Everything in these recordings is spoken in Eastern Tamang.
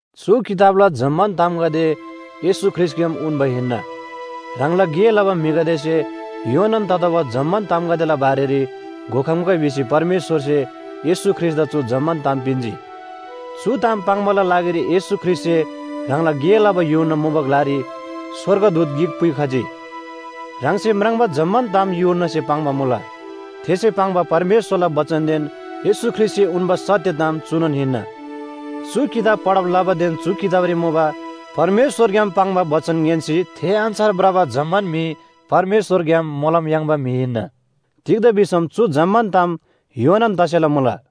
चु किताबला जम्‍मान तामगदे येशू ख्रीष्‍टग्‍याम उन्‍बा हिन्‍ना। ह्राङला गे लबा म्‍हिगदेसे योनान ततोःबा जम्‍मान तामगदेला बारेरी घोखम्‍गै भिसी परमेश्‍वरसे येशू ख्रीष्‍टदा चु जम्‍मान ताम पिन्‍जी। चु ताम पाङ्‌बाला लागिरी येशू ख्रीष्‍टसे ह्राङला गे लबा यूहन्‍ना मुबा ग्‍लारी स्‍वर्गदूत गिक पुइखजी। ह्राङसे म्राङ्बा जम्‍मान ताम यूहन्‍नासे पाङ्बा मुला। थेसे पाङ्बा परमेश्‍वरला बचनदेन येशू ख्रीष्‍टसे उन्‍बा सत्‍य ताम चुनोन हिन्‍ना। चु किताब पढब लबादेन चु किताबरी मुबा परमेश्‍वरग्‍याम पाङ्बा बचन ङ्‌यान्‍सी थे अन्‍छार भ्रबा जम्‍मान म्‍हि परमेश्‍वरग्‍याम मोलम याङ्बा म्‍हि हिन्‍ना। तिग्‍दा भिसम चु जम्‍मान ताम योनान तसेला मुला।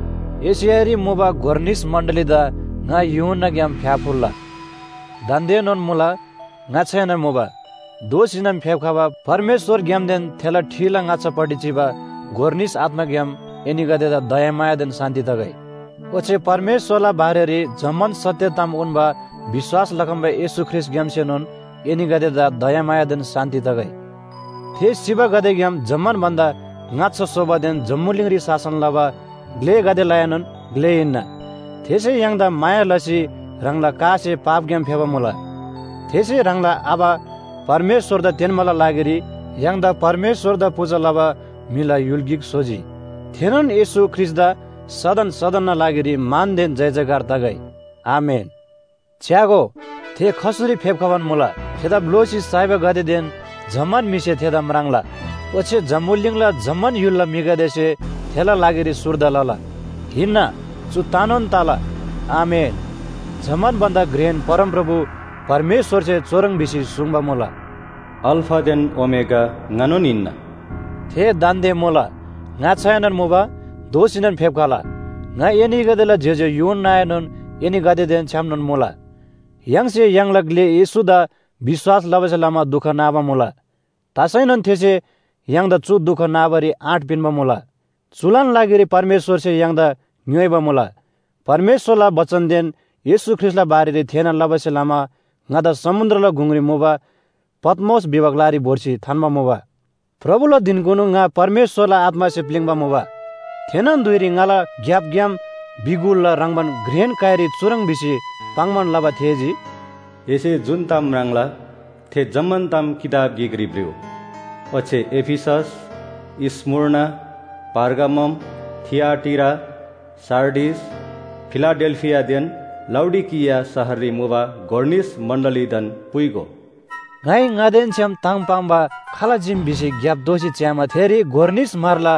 एशियारी मुबा गोर निस मण्‍डलीदा ङा यूहन्‍नाग्‍याम फ्‍याफुल्‍ला। दान्‍देनोन मुला, ङाच्‍छाएनोन मुबा, दोःसीनोन फेप्‍खबा परमेश्‍वरग्‍यामदेन थेला ठिला ङाच्‍छापट्टि चिबा गोर निस आत्‍माग्‍याम एनीगदेदा दयामायादेन शान्‍ति तगै। ओच्‍छे परमेश्‍वरला बारेरी जम्‍मान सत्‍य ताम उन्‍बा विश्‍वास लखम्‍बा येशू ख्रीष्‍टग्‍यामसेनोन एनीगदेदा दयामायादेन शान्‍ति तगै। थे सिबागदेग्‍याम जम्‍मान भन्‍दा ङाच्‍छा सोबादेन जम्‍बुलिङरी शासन लबा ग्‍लेगदेलाएनोन ग्‍ले हिन्‍ना। थेसे य्‍हाङदा माया लसी ह्राङला कासे पापग्‍याम फेबा मुला। थेसे ह्राङला आबा परमेश्‍वरदा तेन्‍बाला लागिरी य्‍हाङदा परमेश्‍वरदा पूजा लबा म्‍हिला य्‍हुल गिक स्‍होजी। थेनोन येशू ख्रीष्‍टदा सदन सदनना लागिरी मानदेन जयजयकार तगै। आमेन। च्‍यागो, थे खसुरी फेप्‍खबान मुला, थेदा भ्‍लोसी साइबागदेदेन जम्‍मान म्‍हिसे थेदा म्राङ्ला। ओच्‍छे जम्‍बुलिङला जम्‍मान य्‍हुलला म्‍हिगदेसे थेला लागिरी सुर्दा लला। हिन्‍ना चु तनोन तला। आमेन। जम्‍मान भन्‍दा घ्रेन परमप्रभु परमेश्‍वरसे चुह्रङ् भिसी सुङ्बा मुला, “अल्‍फादेन ओमेगा ङानोन हिन्‍ना,” थे दान्‍दे मुला, ङाच्‍छाएनोन मुबा, दोःसीनोन फेप्‍खला। ङा एनीगदेला ज्‍योज्‍यो यूहन्‍नाएनोन एनीगदेदेन छ्‌यामनोन मुला। य्‍हाङसे य्‍हाङला ग्‍ले येशूदा विश्‍वास लबासे लमा दुख नाबा मुला, तसैनोन थेसे य्‍हाङदा चु दुख नाबारी आँट पिन्‍बा मुला। चुलान लागिरी परमेश्‍वरसे य्‍हाङदा ङ्‌योइबा मुला। परमेश्‍वरला बचनदेन येशू ख्रीष्‍टला बारेरी थेःना लबासे लमा ङादा समुन्‍द्रला गुङरी मुबा पत्‍मोस भिबा ग्‍लारी भोर्सी थान्‍बा मुबा। प्रभुला धिनकुनु ङा परमेश्‍वरला आत्‍मासे प्‍लिङ्बा मुबा। थेनोन धुइरी ङाला ग्‍यापग्‍याम बिगुलला ह्रङ्‌बान घ्रेन काइरी चुह्रङ् भिसी पाङ्‌बान लबा थेःजी, “एसे जुन ताम म्राङ्ला थे जम्‍मान ताम किताब गिकरी भ्रिउ। ओच्‍छे एफिसस, स्‍मुर्ना, पर्गामम, थिआटीरा, सार्डिस, फिलाडेल्‍फियादेन लाउडिकिया शहररी मुबा गोर निस मण्‍डलीदान पुइगो।” ङाइ ङादेन छ्‌याम ताम पाङ्बा खाल चीम भिसी ग्‍याप दोःसी च्‍यामा थेरी गोर निस म्‍हरला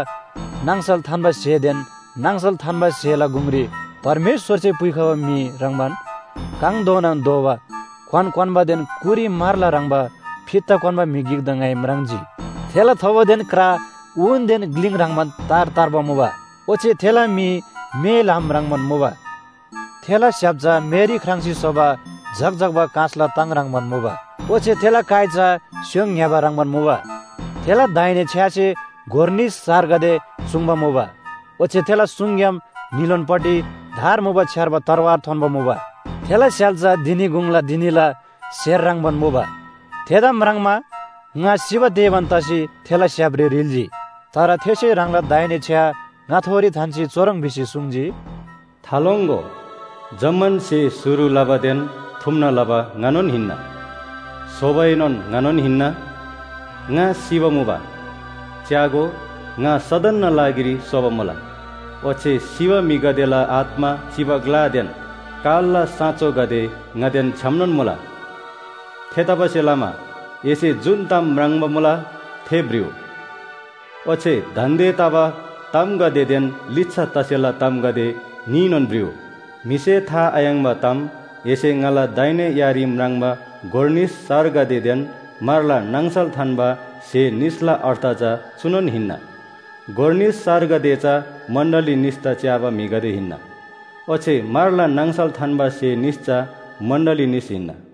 नाङसल थान्‍बा स्‍हेदेन, नाङसल थान्‍बा स्‍हेला गुङरी परमेश्‍वरसे पुइखबा म्‍हि ह्रङ्‌बान काङधोनान धोबा क्‍वान क्‍वान्‍बादेन कुरी म्‍हरला ह्रङ्‌बा फित्ता क्‍वान्‍बा म्‍हि गिकदा ङाइ म्राङ्जी। थेला थोबोदेन क्रा ऊनदेन ग्‍लिङ ह्रङ्‌बान तार तार्बा मुबा। ओच्‍छे थेला मी मे ल्‍हाम ह्रङ्‌बान मुबा। थेला स्‍य्‍हाप चा मेरी ख्राङ्‌सी स्‍होबा झक्‍झक्‍बा काँसला ताङ ह्रङ्‌बान मुबा। ओच्‍छे थेला काइ चा स्‍योङ ङ्‌यबा ह्रङ्‌बान मुबा। थेला दाहिने छ्‌यासे गोर निस सारगदे चुङ्बा मुबा। ओच्‍छे थेला सुङग्‍याम न्‍हीलोनपट्टि धार मुबा छ्‌यार्बा तरवार थोन्‍बा मुबा। थेला स्‍य्‍हाल चा धिनी गुङला धिनीला स्‍हेर ह्रङ्‌बान मुबा। थेदा म्राङ्मा ङा सिबा तेबान तसी थेला स्‍य्‍हापरी ह्रिल्‍जी। तर थेसे ह्राङला दाहिने छ्‌या ङाथोरी थान्‍सी चुह्रङ् भिसी सुङ्जी, “थालोङ्‍गो, जम्‍मान स्‍हे शुरु लबादेन थुम्‍ना लबा ङानोन हिन्‍ना। सोबाएनोन ङानोन हिन्‍ना। ङा सिबा मुबा। च्‍यागो, ङा सदनना लागिरी सोबा मुला। ओच्‍छे सिबा म्‍हिगदेला आत्‍मा चिबा ग्‍लादेन कालला साँचोगदे ङादेन छ्‌यामनोन मुला। थेतबासेलमा एसे जुन ताम म्राङ्बा मुला थे भ्रिउ। ओच्‍छे दान्‍दे तबा तामगदेदेन लिच्‍छा तसेला तामगदे न्‍हीनोन भ्रिउ। म्‍हिसे था आयाङ्‍बा ताम एसे ङाला दाहिने यारी म्राङ्बा गोर निस सारगदेदेन म्‍हरला नाङसल थान्‍बा स्‍हे निसला अर्थ चा चुनोन हिन्‍ना। गोर निस सारगदे चा मण्‍डली निसदा च्‍याबा म्‍हिगदे हिन्‍ना। ओच्‍छे म्‍हरला नाङसल थान्‍बा स्‍हे निस चा मण्‍डली निस हिन्‍ना।”